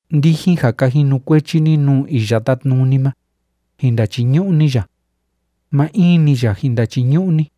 Ndijin ja ka jinukuechi ni nuu Iya Tátnuni ma, jin ndachiñu'u ni ya. Maa in‑ni ya jin ndachiñu'u ni.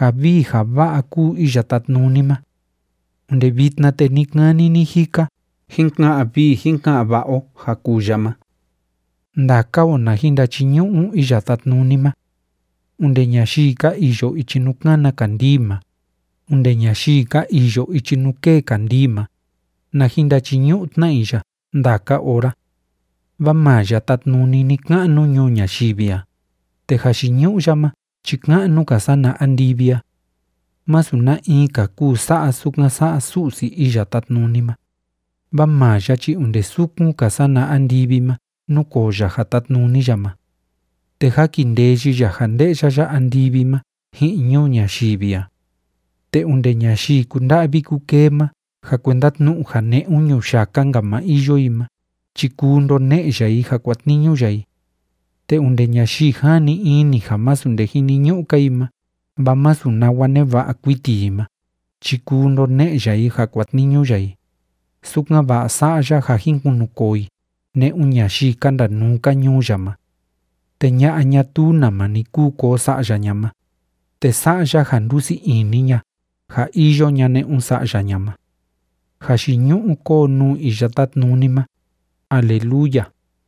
Ja vii ja va'a kúu Iya Tátnuni ma. Onde vitna te ni‑kani ni‑jika jin ka'an vii jin ka'an va'a o ja kuu ya ma. Ndaka o na jin ndachiñu'u Iya Tátnuni ma. Onde ñayii ka iyo ichi nuu kána kandii ma, onde ñayii ka iyo ichi nuu kée kandii ma, na jin ndachiñu'u tna i ya ndaka ora. Vaa maa ya tátnuni ni‑ka'nu ñuu ñayivi a, te jayiñu'u ya ma chi ka'nu‑ka sana andivi a. Másu na in‑ka kuu sa'a sukan sa'a Su'si Iya Tátnuni ma, vaa maa ya chi onde sukun‑ka sana andivi ma núkoo ya ja tátnuni ya ma. Te jákindeyi ya ja nde'ya ya andivi ma ji'in ñuu ñayivi a. Te onde ñayii kúnda'vi kúkee ma ja kuenda tnu'u ja ne'un ñuyaka‑nka ma iyo i ma chi kuu ndone'e ya i ja kuatniñu ya i. Te onde ñayii jani ini ja másu nde jiniñu'u‑ka i ma vaa másu nawa neva'a kuiti i ma chi kuu ndone'e ya i ja kuatniñu ya i, sukan‑va'a sa'a ya ja jin kunukoo i ne'un ñayii ka ndanuu‑ka ñuu ya ma. Te ña'a ñatuu nama ni kúu koo sa'ya ña ma, te sa'a ya ja ndusii ini ña ja iyo ña ne'un sa'ya ña ma. ¡Jayiñu'u kóo nuu Iya Tátnuni ma! ¡Aleluya!